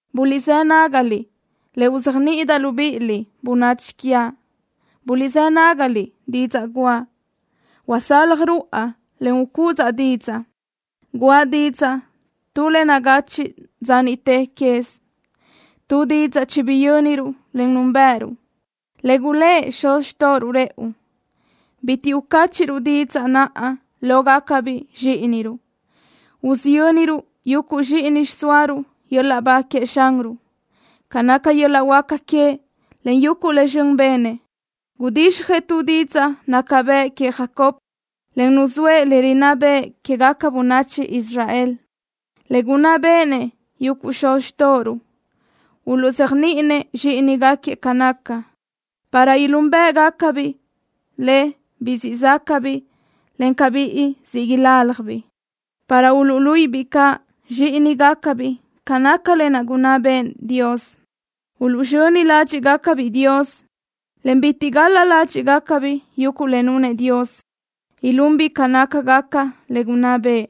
Buliʼzë́ nágaliʼ le uzéajniʼidaʼ libíʼiliʼ, bönachi quiaʼ. Buliʼzë́ nágaliʼ didzaʼ guʼa. Usaljaʼ ruáʼa, en ucúdzuʼa didzaʼ. Guʼa didzaʼ tu le nagachiʼ dza niʼte quez, tu didzaʼ chibiyönruʼ, en núnbëʼëruʼ, le gulë́ʼ xuz xtóʼoruʼ rëʼu. Bitiʼ ucáchiʼruʼ didzaʼ naʼ lógacabiʼ zxíʼiniruʼ. Usiyönruʼ yuguʼ zxíʼini xiʼsóaruʼ yöl-laʼ ba queëʼ Xanruʼ, ca naca yöl-laʼ huáca queëʼ, en yuguʼ le zxön benëʼ. Gudixjëʼ tu didzaʼ naca bëʼ queëʼ Jacob, en nuzóëʼ le rinná bëʼë quégaca bönachi Israel, le gunná béʼenëʼ yuguʼ xuz xtóʼoruʼ. Uluʼzéajniʼinëʼ zxíʼinigaquiëʼ ca naca, para ilúnbëʼgacabiʼ le, biʼi siʼ záʼgacabiʼ, encaʼ biʼi siʼ iláljabiʼ, para uluʼluíʼibiʼ caʼ zxíʼinigacabiʼ ca naca lë naʼ gunná bëʼë Dios. Uluʼzxöni ládxiʼgacabiʼ Dios, en bitiʼ gal-la ládxiʼgacabiʼ yuguʼ le nunëʼ Dios. Ilunbiʼ ca nácagaca le gunná bëʼë,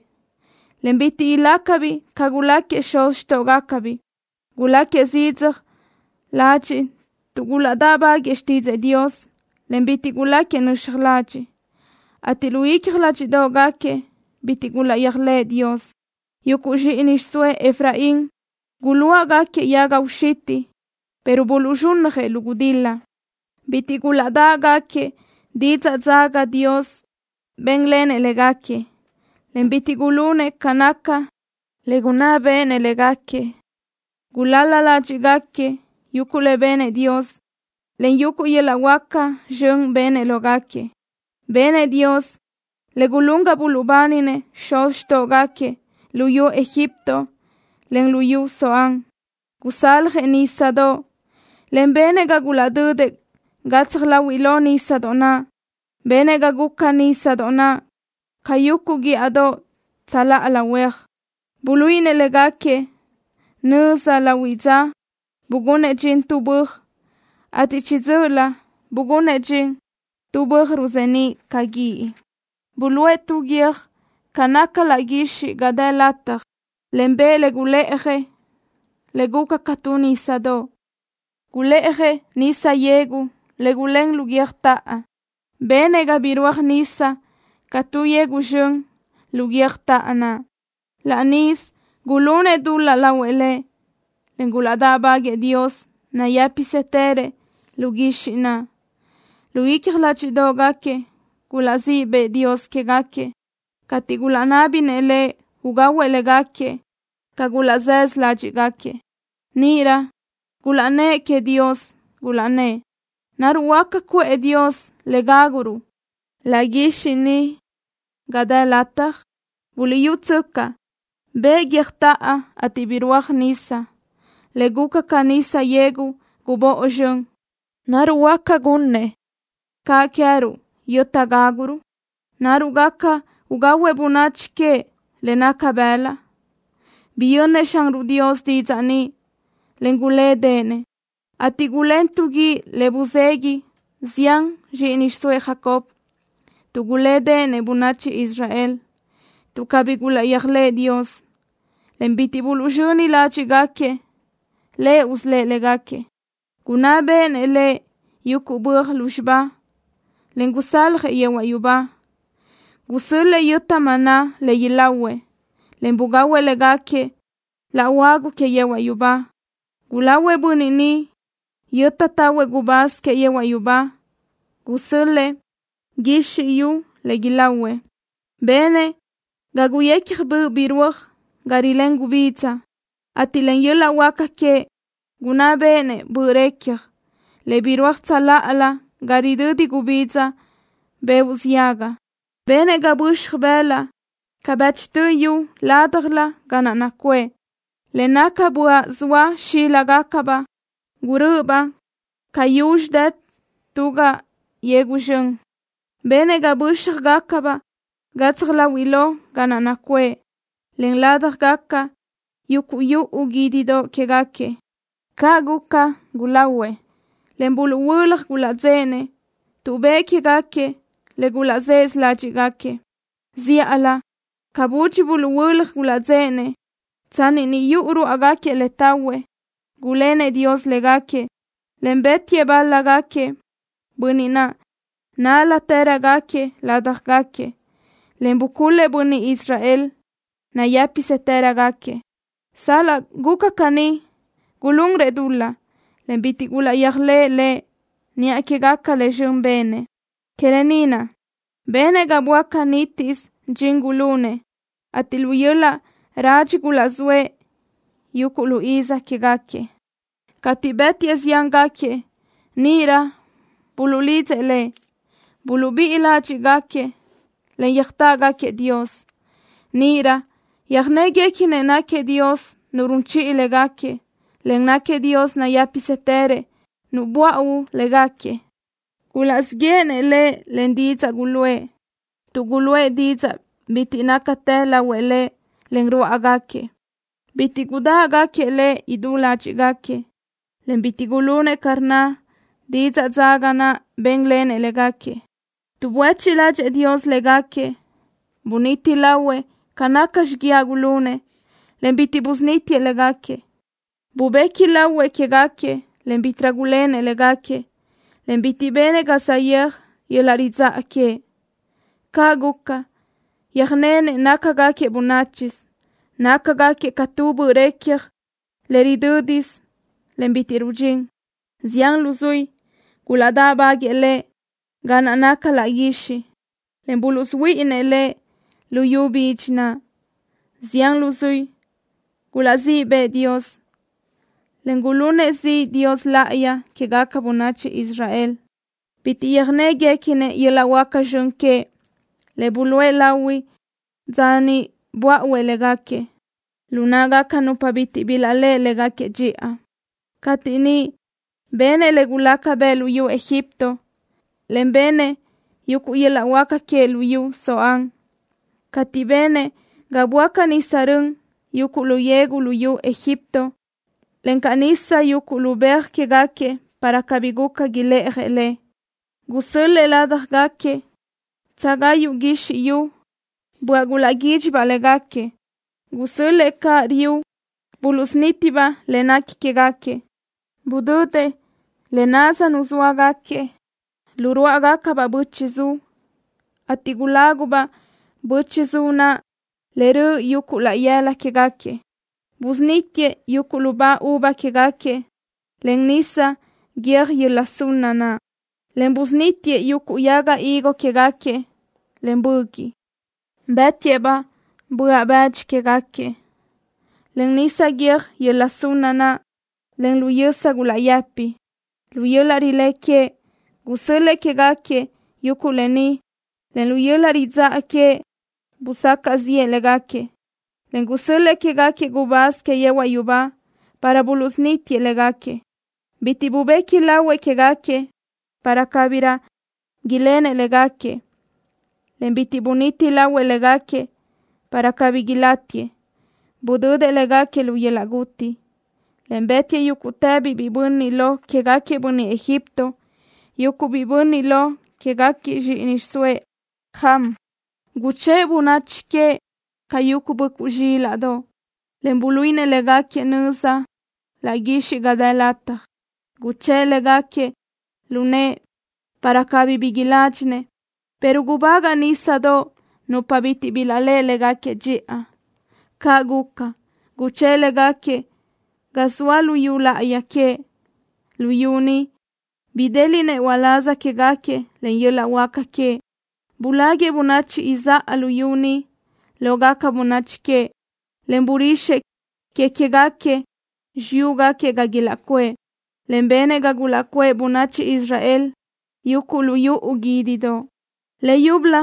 en bitiʼ ilácagacabiʼ ca guláquiëʼ xuz xtóʼogacabiʼ. Guláquiëʼ zidzaj ladxiʼ tuʼ gulaʼdáʼbaguëʼë xtídzëʼë Dios, en bitiʼ guláquiëʼ nöxaj ladxiʼ, ateʼ lu icja ládxiʼdoʼgaquiëʼ bitiʼ gulaʼyéajlëʼë Dios. Yuguʼ zxíʼini xiʼsóëʼ Efraín guluáʼgaquiëʼ yaga uxitiʼ, pero buluʼzxúnnajëʼ lu gudil-la. Bitiʼ gulaʼdáʼgaquiëʼ didzaʼ dzaga Dios bénlenëʼ légaquiëʼ, en bitiʼ gulunëʼ ca naca le gunná béʼenëʼ légaquiëʼ. Gulal-la ládxiʼgaquiëʼ yuguʼ le benëʼ Dios, en yuguʼ yöl-laʼ huáca zxön benëʼ lógaquiëʼ. Benëʼ Dios le gulún ga buluʼbáninëʼ xuz xtóʼogaquiëʼ luyú Egipto, en luyú Zoán. Gusaljëʼ nísadoʼ, en benëʼ ga gulaʼdödëʼ gatsaj láhuiʼlö nísadoʼ naʼ. Benëʼ ga guca nísadoʼ naʼ ca yuguʼ guíʼadoʼ tsöláʼa huéaj. Buluíʼinëʼ légaquiëʼ nöza lahuiʼ dza, bugunëʼ dxin tu böaj, ateʼ chiʼi dzö́ʼölö bugunëʼ dxin tu böaj ruzeníʼ ca guíʼ. Bulë́ʼë tu guiö́j ga naca laʼ guixiʼ ga dë lataj, en bëʼë le gulë́ʼajëʼ le guca ca tu nísadoʼ. Gulë́ʼajëʼ nisa yegu le gulén lu guiö́jtoʼo. Benëʼ ga birúaj nisa ca tu yegu zxön lu guiö́jtoʼo naʼ. Laʼ níʼisö gulunëʼ dul-laʼ lahuëʼ Lëʼ, en gulaʼdáʼbaguëʼë Dios nayë́pisëtërëʼ laʼ guixiʼ naʼ. Lu icja ládxiʼdoʼgaquiëʼ gulaʼzíʼ bëʼë Dios quégaquiëʼ, cateʼ gulaʼnábinëʼ Lëʼ ugahuëʼ légaquiëʼ ca gulaʼzësö ládxiʼgaquiëʼ. Níʼirö gulaʼnnë́ʼ queëʼ Dios, gulaʼnnë́ʼ: “¿Naruʼ huáca cuʼë Dios le gáguruʼ laʼ guixiʼ ni ga dë lataj? Buliʼyútsöcaʼ, bëʼë guiö́jtoʼo, ateʼ birúajdaʼ nisa, le guca ca nisa yegu gubóʼo zxön. ¿Naruʼ huáca gunnëʼ caʼ queë́ruʼ yöta gáguruʼ? ¿Naruʼ gaca ugahuëʼ bönachi queëʼ le naca bëlaʼ?” Biyönnëʼ Xanruʼ Dios didzaʼ ni, en gulédeʼenëʼ, ateʼ gulén tu guíʼ le buzegui zián zxíʼini xiʼsóëʼ Jacob, tuʼ gulédeʼenëʼ bönachi Israel, tuʼ cabí gulaʼyéajlëʼë Dios, en bitiʼ buluʼzxöni ládxiʼgaquiëʼ Lëʼ usölë́ʼ légaquiëʼ. Gunná béʼenëʼ Lëʼ yuguʼ böaj lúzxiba, en gusaljëʼ yehuaʼ yubá. Gusö́l-lëʼë yöta maná le ilahuëʼ, en bugahuëʼ légaquiëʼ laʼ huagu que yehuaʼ yubá. Gulahuëʼ bönniʼ niʼ yöta tahuëʼ gubáz que yehuaʼ yubá. Gusö́l-lëʼë guizxi yu le ilahuëʼ. Benëʼ ga guyecja böʼ birúaj ga rilén gubidza, ateʼ len yöl-laʼ huáca queëʼ gunná béʼenëʼ böʼ recja le birúaj tsöláʼalö ga ridödi gubidza beoʼ ziaga. Benëʼ ga böxaj bëlaʼ ca bëchtö yu ládjalö ga naʼ nacuʼë, le naca böaʼ zoa xíligacabaʼ gurö́ʼöbaʼ ca yuzxi dë tu raʼ yegu zxön. Benëʼ ga bö́xjagacabaʼ gatsaj láhuiʼlö ga naʼ nacuʼë, en ládjagaca yuguʼ yuʼu guídidoʼ quégaquiëʼ. Caʼ guca, gulahuëʼ, en buluʼhuö́laj gulaʼdzéʼenëʼ, tuʼ bëʼë quégaquiëʼ le gulaʼzësö ládxiʼgaquiëʼ. Zíʼalö ca budxi buluʼhuö́laj gulaʼdzéʼenëʼ, tsanni niʼ yuʼu ruáʼagaquiëʼ le tahuëʼ, gulénëʼ Dios légaquiëʼ, en bë́tiëʼ bál-lagaquiëʼ, bönniʼ nál-latërögaquiëʼ ládjagaquiëʼ, en bucul-lëʼ bönniʼ Israel nayë́pisëtërögaquiëʼ. Sal-laʼ guca caní, gulunrëʼ dul-laʼ, en bitiʼ gulaʼyéajlëʼë Lëʼ niʼa quégaca le zxön benëʼ. Que lë ni naʼ benëʼ ga böáca nítisö dxin gulunëʼ, ateʼ lu yöl-laʼ radxi gulaʼzóëʼ yuguʼ lu iz quégaquiëʼ. Cateʼ bë́tiëʼ ziángaquiëʼ, níʼirö buluʼlidzëʼ Lëʼ. Buluʼbíʼi ládxiʼgaquiëʼ, en yöjtáʼgaquiëʼ Dios. Níʼirö yöjnéguequinëʼ náquiëʼ Dios Nu run chiʼi légaquiëʼ, en náquiëʼ Dios nayë́pisëtërëʼ Nu böáʼuö légaquiëʼ. Gulaʼzíʼ yéʼenëʼ Lëʼ len didzaʼ guluʼë, tuʼ guluʼë dizaʼ bitiʼ nácatë lahuëʼ Lëʼ len ruáʼagaquiëʼ. Bitiʼ gudáʼgaquiëʼ Lëʼ idú ládxiʼgaquiëʼ, en bitiʼ gulunëʼ ca rnna didzaʼ dzaga naʼ bénlenëʼ légaquiëʼ. Tuʼ buéchiʼ ládxëʼë Dios légaquiëʼ, buniti lahuëʼ ca naca xiguiaʼ gulunëʼ, en bitiʼ busunítiëʼ légaquiëʼ. Bubequi lahuëʼ quégaquiëʼ, en bítiʼrö gulénëʼ légaquiëʼ, en bitiʼ benëʼ ca saʼyéaj yöl-laʼ ridzáʼa queëʼ. Caʼ guca, yöjnenëʼ nácagaquiëʼ bönáchisö. Nácagaquiëʼ ca tu böʼ recja le ridö́disö, en bitiʼ rudxín. Zián luzuí gulaʼdáʼbaguëʼë Lëʼ ga naʼ naca laʼ guixiʼ, en buluʼsuhuíʼinëʼ Lëʼ lu yu bidxi naʼ. Zián luzuí gulaʼzíʼ bëʼë Dios, en gulunëʼ ziʼ Dios Láʼayi quégaca bönachi Israel. Bitiʼ yöjnéguequinëʼ yöl-laʼ huáca zxön queëʼ, le buluʼe lahui dza niʼ böáʼuëʼ légaquiëʼ lu náʼagaca nupa bitiʼ bilaʼléʼe légaquiëʼ dxiʼa, cateʼ niʼ benëʼ le gulaca bëʼ luyú Egipto, en benëʼ yuguʼ yöl-laʼ huáca queëʼ luyú Zoán, cateʼ benëʼ ga böáca nisa rön yuguʼ lu yegu luyú Egipto, encaʼ nisa yuguʼ lu beaj quégaquiëʼ para cabí guca ilë́ʼajëʼ le. Gusö́l-lëʼë ládjagaquiëʼ bö́tsugayu guizxi yu, böaʼ gulaʼguídxibaʼ légaquiëʼ. Gusö́l-lëʼë caʼ riu buluʼsunítibaʼ le nequi quégaquiëʼ. Budödëʼ le naz nuzóagaquiëʼ lu ruáʼagacabaʼ böchiʼ zu, ateʼ gulágubaʼ böchiʼ zu naʼ le röʼö yuguʼ laʼ yëla quégaquiëʼ. Busunítiëʼ yuguʼ lubá uva quégaquiëʼ len nisa guiö́j yöla sunna naʼ, en busunítiëʼ yuguʼ yaga higo quégaquiëʼ len böguiʼ. Bë́tiëʼ-baʼ böaʼ-bëdxi quégaquiëʼ len nisa guiö́j yöla sunna naʼ, en lu yösa gulaʼyëpi. Lu yöl-laʼ rilé queëʼ gusö́l-lëʼë quégaquiëʼ yuguʼ lë ni, en lu yöl-laʼ ridzáʼa queëʼ busacaʼ ziʼë légaquiëʼ, en gusö́l-lëʼë quégaquiëʼ gubáz que yehuaʼ yubá para buluʼsunítiëʼ légaquiëʼ. Bitiʼ bubequi lahuëʼ quégaquiëʼ para cabirö lenëʼ légaquiëʼ, en bitiʼ buniti lahuëʼ légaquiëʼ para cabí ilátiëʼ. Budödëʼ légaquiëʼ lu yöl-laʼ guti, en bë́tiëʼ yúguʼtëbiʼ biʼi bönniʼ lo quégaquiëʼ bönniʼ Egipto, yuguʼ biʼi bönniʼ lo quégaquiëʼ zxíʼini xiʼsóëʼ Ham. Guchë́ʼë bönachi queëʼ ca yuguʼ böʼcuʼ zxílaʼdoʼ, en buluíʼinëʼ légaquiëʼ nöza laʼ guixiʼ ga dë lataj. Guchë́ʼë légaquiëʼ lu nëʼë para cabí bi iládxinëʼ, pero gubagaʼ nísadoʼ nupa bitiʼ bilaʼléʼe légaquiëʼ dxiʼa. Caʼ guca, guchë́ʼë légaquiëʼ ga zoa luyú láʼayi queëʼ, luyú ni bidéliʼnëʼ uláz quégaquiëʼ len yöl-laʼ huáca queëʼ. Buláguiʼë bönachi izáʼa luyú ni lógaca bönachi queëʼ, en burixëʼ que queë́gaquiëʼ xiyúgaquiëʼ ga ilaʼcuʼë, en benëʼ ga gulaʼcuʼë bönachi Israel yuguʼ lu yuʼu guídidoʼ. Le yúbölö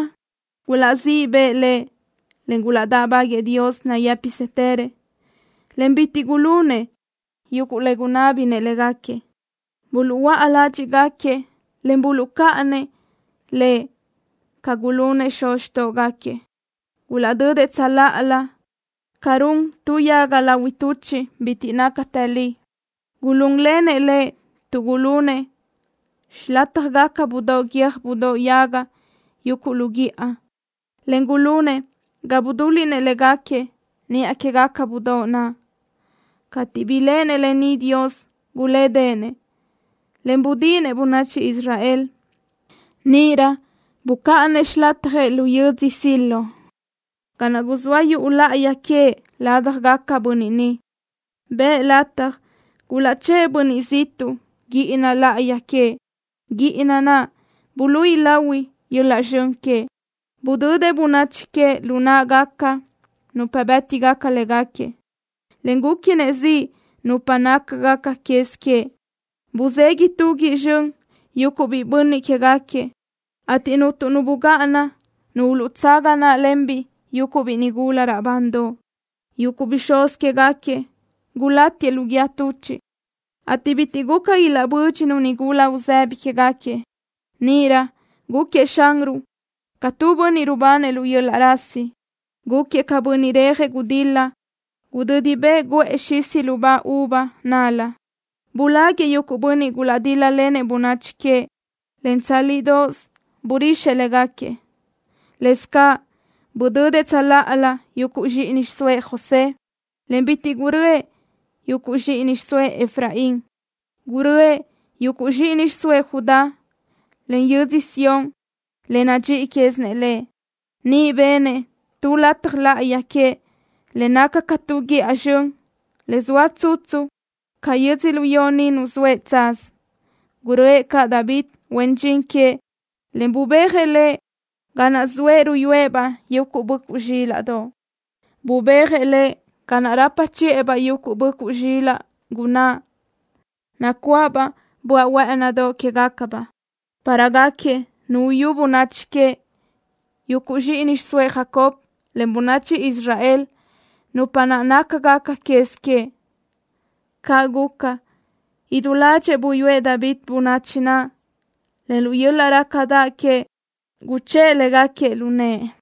gulaʼzíʼ bëʼë Lëʼ, en gulaʼdáʼbaguëʼë Dios nayë́pisëtërëʼ, en bitiʼ gulunëʼ yuguʼ le gunná béʼenëʼ légaquiëʼ. Buluʼhuö́a ládxiʼgaquiëʼ, en buluʼcáʼanëʼ Lëʼ ca gulunëʼ xuz xtóʼgaquiëʼ. Gulaʼdödëʼ tsöláʼalö ca run tu yaga lahui tuchiʼ bitiʼ nácatë li. Gulún lenëʼ Lëʼ tuʼ gulunëʼ xilátjagaca budóʼ guiö́j budóʼ yaga yuguʼ lu guíʼa, en gulunëʼ ga budúliʼnëʼ légaquiëʼ niʼa quégaca budóʼ naʼ. Cateʼ biléʼenëʼ lë ni Dios, gulédeʼenëʼ, en budíʼinëʼ bönachi Israel. Níʼirö bucáʼanëʼ xilatjëʼ lu yödzö Siló, ga naʼ guzóa yuʼu láʼayi queëʼ ládjagaquiëʼ bönniʼ niʼ. Bëʼë lataj gulaʼchë́ʼë bönniʼ ziʼtuʼ guíʼina láʼayi queëʼ, guíʼina naʼ buluíʼi lahui yöl-laʼ zxön queëʼ. Budödëʼ bönachi queëʼ lu náʼagaca nupa bë́tigaca léguequi, en gúquinëʼ ziʼ nupa nácagaca quez queëʼ. Buzegui tu guíʼ zxön yuguʼ biʼi bönniʼ quégaquiëʼ, ateʼ cuntu nu bugáʼana nu uluʼtsaga naʼlenbiʼ yuguʼ biʼi nigula raʼbandoʼ. Yuguʼ bixúz quégaquiëʼ gulátiëʼ lu guíë tuchiʼ, ateʼ bitiʼ guca ilaʼbö́dxinu nigula uzëbi quégaquiëʼ. Níʼirö gúquiëʼ Xanruʼ ca tu bönniʼ rubanëʼ lu yöl-laʼ rasi. Gúquiëʼ ca bönniʼ rejëʼ gudil-la gudödi bëʼë guʼë xisi lubá uva nál-la. Buláguiʼë yuguʼ bönniʼ gulaʼdíl-lalenëʼ bönachi queëʼ, en tsálidoʼos burixëʼ légaquiëʼ. Lëscaʼ budödëʼ tsöláʼalö yuguʼ zxíʼini xiʼsóëʼ José, en bitiʼ gurö́ëʼ yuguʼ zxíʼini xiʼsóëʼ Efraín. Gurö́ëʼ yuguʼ zxíʼini xiʼsóëʼ Judá, en yödzö Sión le nadxíʼi quézinëʼ Lëʼ. Niʼ benëʼ tu lataj láʼayi queëʼ le naca ca tu guíʼa zxön, le zoa tsutsu ca yödzölió ni nuzóëʼ tsaz. Gurö́ëʼ caʼ David, huen dxin queëʼ, en bubéajëʼ lëʼ ga naʼ zoëʼ ruyúëʼ-baʼ yuguʼ böʼcuʼ zxílaʼdoʼ. Bubéajëʼ lëʼ ga naʼ rapa chiʼë-baʼ yuguʼ böʼcuʼ zxilaʼ gunáʼ, nacuáʼabaʼ böaʼ huë́ʼënidoʼ quégacabaʼ, para gáquiëʼ nu uyú bönachi queëʼ, yuguʼ zxíʼini xiʼsóëʼ Jacob, en bönachi Israel, nupa naʼ nácagaca quez queëʼ. Caʼ guca, idú ládxëʼë buyúëʼ David bönachi naʼ, en lu yöl-laʼ rácadaʼ queëʼ guchë́ʼë légaquiëʼ lu nëʼë.